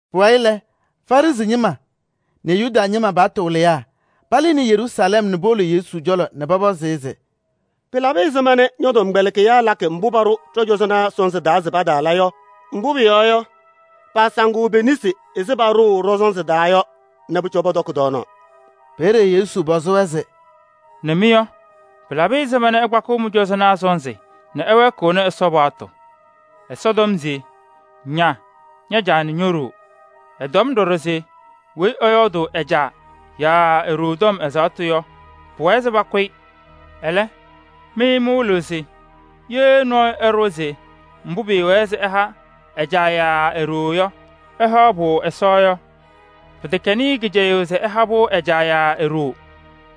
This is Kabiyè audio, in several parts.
Pʋwayɩ lɛ, Farɩsɩ ñɩma nɛ Yuda ñɩma paɣtʋ wɩlɩyaa palɩnɩ Yeruusalɛm nɛ powolo Yesu cɔlɔ nɛ pɔpɔzɩ-ɩ se: “Pɩlabɩ ɛzɩma nɛ ñɔ-tɔmkpɛlɩkɩyaa lakɩ mbʋ paɖʋ ɖɔ-cɔzɔnaa sɔnzɩ taa se pataala yɔ? Mbʋ pʋyɔɔ yɔ, paasaŋɩɣ pe-nesi ɛzɩ paɖʋʋ pɔ-sɔnzɩ taa yɔ nɛ pʋcɔ pɔtɔkɩ tɔɔnaɣ.” Peeye Yesu pɔzɩ-wɛ se: “Nɛ mɩ yɔ, pɩlabɩ ɛzɩma nɛ ɩkpakɩɣ mɩ-cɔzɔnaa sɔnzɩ nɛ ɩwɛɛkɩɣnɩ Ɛsɔ paɣtʋ? Ɛsɔ tɔm se: ‘Ña ña-caa nɛ ño-ɖoo.’ Ɛtɔm ɖɔɖɔ se: ‘Weyi ɛyɔɔdʋʋ ɛ-caa yaa e-ɖoo tɔm ɛzaɣtʋ yɔ, pʋwɛɛ se pakʋ-ɩ.’ Ɛlɛ, mɩ mɩwɩlɩɣ se: ‘Ye nɔɔyʋ ɛɖʋwa se mbʋ pɩɩwɛɛ se ɛha ɛ-caa yaa e-ɖoo yɔ, ɛha-pʋ Ɛsɔ’ yɔ, pɩtɛkɛnɩ-ɩ kɩcɛyʋʋ se ɛha-pʋ ɛ-caa yaa e-ɖoo.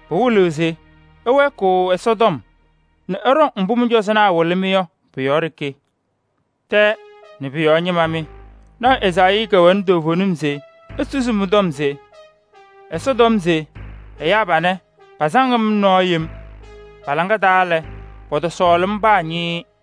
Pɩwɩlɩɣ se ɩwɛɛkɩɣ Ɛsɔtɔm nɛ ɩɖɔŋ mbʋ mɩ-cɔzɔnaa wɩlɩ-mɩ yɔ pʋ-yɔɔ ɖeke. Tɛɛ nɛ pʋ-yɔɔ ñɩma mɩ! Lɔɔyaɣ tʋ Ezaayii kɛwɛnɩ toovenim se esusi mɩ-tɔm se: ‘Ɛsɔ tɔm se ɛyaa panɛ, pasaŋ-m nɛ nɔɔ yem. Pa-laŋa taa lɛ, pɔtɔsɔɔlɩ-m paa ñɩɩɩ.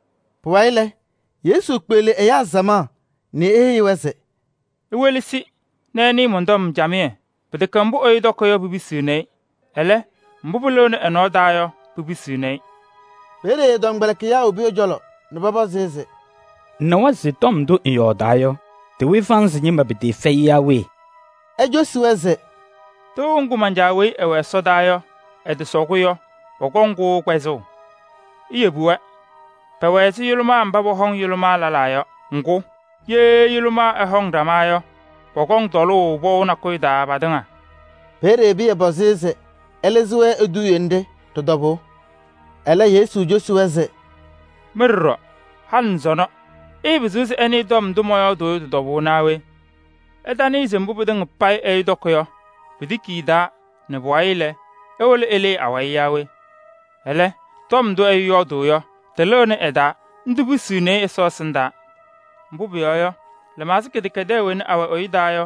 Pʋwayɩ lɛ, Yesu kpeɣli ɛyaa samaɣ nɛ eheyi-wɛ se: “Iwelesi nɛ ɩnɩɩ mɔn-tɔm camɩyɛ. Pɩtɛkɛ mbʋ ɛyʋ tɔkɩ yɔ, pipisiɣni-i. Ɛlɛ, mbʋ pɩlɩɣnɩ ɛ-nɔɔ taa yɔ, pipisiɣni-i.” Peeye ɛ-tɔmkpɛlɩkɩyaa wobi ɛ-cɔlɔ nɛ pɔpɔzɩ-ɩ se: “Ŋnawa se tɔm ndʋ ŋyɔɔdaɣ yɔ, tɩwɩ Farɩsɩ ñɩma pɩtɩɩfɛyɩ yaa we?” Ecosi-wɛ se: “Tɩʋ ŋgʋ man-Caa weyi ɛwɛ ɛsɔdaa yɔ, ɛtɔsɔ-kʋ yɔ, pɔkɔŋ-kʋ kpɛzʋʋ. Iyebi-wɛ: pɛwɛ ɛzɩ yʋlʋmaa mba pɔhɔŋ yʋlʋmaa lɛlaa yɔ! Ŋgʋ, ye yʋlʋmaa ɛhɔŋ ɖama yɔ, pɔkɔŋ tɔlʋʋ pɔʋ nakʋyʋ taa patɩŋa.” Peeye Pɩyɛ pɔzɩ-ɩ se ɛlɩzɩ-wɛ eduuye nɖɩ ɖɩ-tɔbʋʋ. Ɛlɛ, Yesu kitini-wɛ se: “Mɩ ɖɔɖɔ, halɩ nɛ sɔnɔ ɩɩpɩzɩɣ se ɩnɩɩ tɔm ndʋ mɔyɔɔdʋʋ yɔ tɩ-tɔbʋʋ naa we? Ɩtanɩɩ se mbʋ pɩtɩŋa payɩ ɛyʋ tɔkɩ yɔ, pitiki ɛ-taa nɛ pʋwayɩ lɛ, ewolo ɛlɩɩ awayɩ yaa we? Ɛlɛ, tɔm ndʋ ɛyʋ yɔɔdʋʋ yɔ, tɩlɩnɩ ɛ-taa, ndʋ pisiɣni-i Ɛsɔ ɛsɩndaa. Mbʋ pʋyɔɔ yɔ, lɩmaɣza kɩdɛkɛdɛɛ wena awɛ ɛyʋ taa yɔ,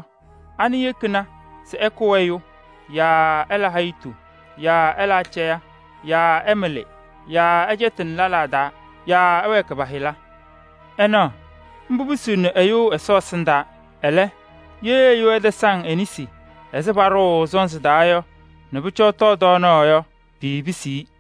ana yekini se ɛkʋ ɛyʋ yaa ɛla hayitu yaa ɛla acɛyɛ yaa ɛmɩlɩ yaa ɛcɛtɩnɩ lɛlaa taa yaa ɛwɛɛkɩ pa-hɩla. Ɩnaɣ, mbʋ pisiɣni ɛyʋ Ɛsɔ ɛsɩndaa. Ɛlɛ, ye ɛyʋ ɛtasaŋ e-nesi ɛzɩ paɖʋʋ sɔnzɩ taa yɔ nɛ pʋcɔ ɛtɔɔ tɔɔnaɣ yɔ, piipisiɣ-i.”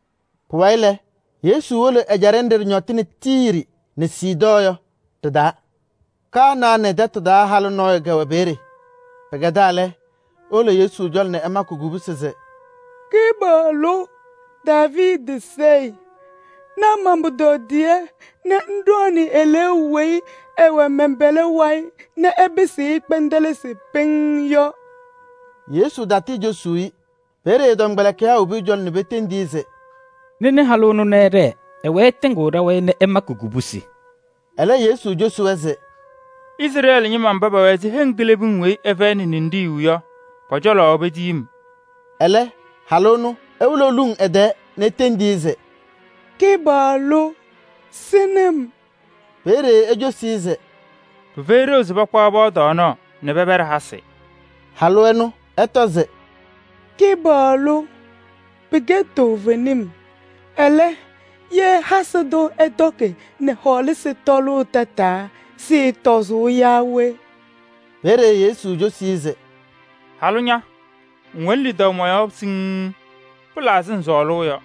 Pʋwayɩ lɛ, Yesu wolo ɛjaɖɛ nɖɩ ɖɩñɔtɩnɩ Tiiri nɛ Sidɔɔ yɔ ɖɩ-taa. Kanaanɩ tɛtʋ taa halʋ nɔɔyʋ kɛwɛ peeye. Pɩkɛdaa lɛ, ewolo Yesu cɔlɔ nɛ ɛmakɩ kubusi se: “Kɩpaɣlʋ, Daaviidi Sayɩ! Na man-pʋtɔdɩyɛ nɛ ŋɖɔɔnɩ eleeu weyi ɛwɛ mɛn-pɛlɛ wayɩ nɛ ɛpɩsɩɣ-ɩ kpɛndɛlɩsɩ pɩŋŋ yɔ!” Yesu tatɩɩcosuu-i. Peeye ɛ-tɔmkpɛlɩkɩyaa wobi ɛ-cɔlɔ nɛ petendi-i se: “Nɩnɩ halʋ ɛnʋ nɛ ɛɖɛɛ. Ɛwɛɛ ɛtɩŋɩɣ ɖa-wayɩ nɛ ɛmakɩ kubusi.” Ɛlɛ, Yesu cosi-wɛ se: “Izrɛɛlɩ ñɩma mba pɛwɛ ɛzɩ heŋ kilebiŋ weyi ɩfɛyɩnɩ ninɖiɣyu yɔ, pɔ-cɔlɔ petiyi-m.” Ɛlɛ halʋ ɛnʋ ewolo eluŋ ɛ-tɛɛ nɛ etendi-i se: “Kɩpaɣlʋ! Sɩnɩ-m!” Peeye ecosi-i se: “Pɩfɛyɩ ɖeu se pakpaɣ piya tɔɔnaɣ nɛ pɛpɛɖɩ hasɩ.” Halʋ ɛnʋ ɛtɔ se: “Kɩpaɣlʋ! Pɩkɛ toovenim. Ɛlɛ, ye hasɩ tʋ ɛtɔkɩ nɛ hɔɔlasɩ tɔʋ tataa, sɩɩtɔzʋʋ yaa we?” Peeye Yesu cosi-i se: “Halʋ ña! Ŋwɛnɩ lidaʋ mɔ-yɔɔ siŋŋ. Pɩla ɛzɩ ŋsɔɔlʋʋ yɔ.”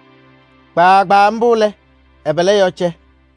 Kpaagbaa mbʋ lɛ, ɛ-pɛlɛ yɔɔ cɛ.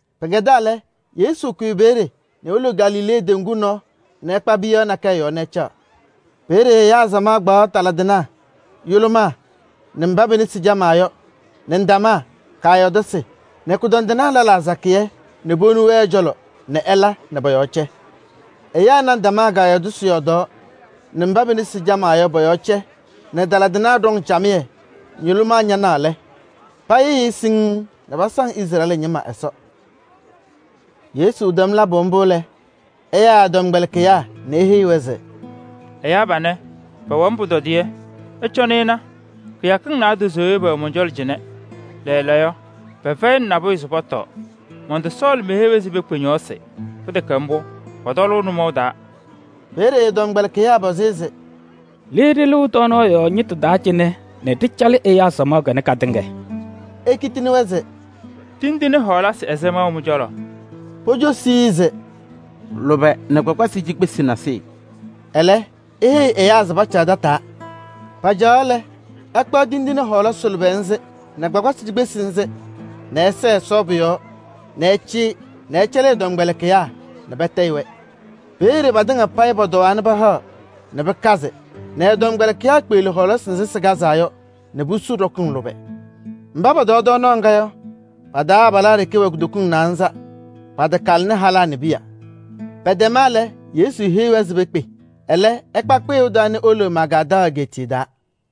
Pɩkɛdaa lɛ, Yesu kʋyɩ peeye nɛ ewolo Galilee teŋgu nɔɔ nɛ ɛkpa piyaɣ nakɛyɛ yɔɔ nɛ ɛcaɣ. Peeye ɛyaa samaɣ kpaɣ taladɩnaa nɛ yʋlʋmaa nɛ mba pe-nesi camaa yɔ nɛ ndamaa kaayɔɔdasɩ nɛ kʋdɔndɩnaa lɛlaa sakɩyɛ nɛ powoni-wɛ ɛ-cɔlɔ nɛ ɛla nɛ pɔ-yɔɔ cɛ. Ɛyaa na ndamaa kaayɔɔdasɩ yɔɔdaɣ nɛ mba pe-nesi camaa yɔ pɔ-yɔɔ cɛ nɛ taladɩnaa ɖɔŋ camɩyɛ nɛ yʋlʋmaa ñanaɣ lɛ, payɩɣyɩɣ-ɩ pɩŋŋ nɛ pasaŋ Izrɛɛlɩ ñɩma Ɛsɔ. Yesu tɛm labʋ mbʋ lɛ, ɛyaa ɛ-tɔmkpɛlɩkɩyaa nɛ eheyi-wɛ se: “Ɛyaa panɛ, pɛwɛ-m pʋtɔdɩyɛ. Ɩcɔnɩ ɩna, kɩyakɩŋ naadozo yɔ pɛwɛ mɔn-cɔlɔ cɩnɛ. Lɛɛlɛɛyɔ, pɛfɛyɩnɩ nabʋyʋ se pɔtɔɔ. Mɔntɔsɔɔlɩ se meheyi-wɛ se pekpe ñɔɔsɩ, pɩtɛkɛ mbʋ, pɔtɔlʋʋ nʋmɔʋ taa.” Peeye ɛ-tɔmkpɛlɩkɩyaa pɔzɩ-ɩ se: “Le ɖɩlɩɣ tɔɔnaɣ yɔɔ ñɩtʋ taa cɩnɛ nɛ ɖɩcalɩ ɛyaa samaɣ kanɛ katɩŋa?” Ekitini-wɛ se: “Tindine ɛzɩma wɛ mɩ-cɔlɔ?” Pocosi-i se: “Lʋbɛ nɛ kpakpasɩ cikpesi nasɩyɩ.” Ɛlɛ, eheyi ɛyaa se pacaɣ tataa. Pacaɣaɣ lɛ, ɛkpaɣ tindine ana a-lʋbɛ nɛ kpakpasɩ cikpesi nzɩ nɛ ɛsɛɛ Ɛsɔ pʋ-yɔɔ nɛ ɛcɩyɩ nɛ ɛcɛlɩ ɛ-tɔmkpɛlɩkɩyaa nɛ patayɩ-wɛ. Peeye patɩŋa payɩ pɔtɔwaa pahaɣ nɛ pɩkazɩ nɛ ɛ-tɔmkpɛlɩkɩyaa kpeɣli hɔɔlasɩ nzɩ sɩkazaa yɔ nɛ pusu ɖɔkɩŋ lʋbɛ. Mba pɔtɔɔ tɔɔnaɣ ŋga yɔ, abalaa ɖeke wɛ kutokiŋ naanza. Patakalɩnɩ halaa nɛ piya. Pɛtɛma lɛ, Yesu heyi-wɛ se pekpe. Ɛlɛ ɛkpa kpɩyʋʋ taa nɛ ewolo Magaadaɣ egeetiye taa.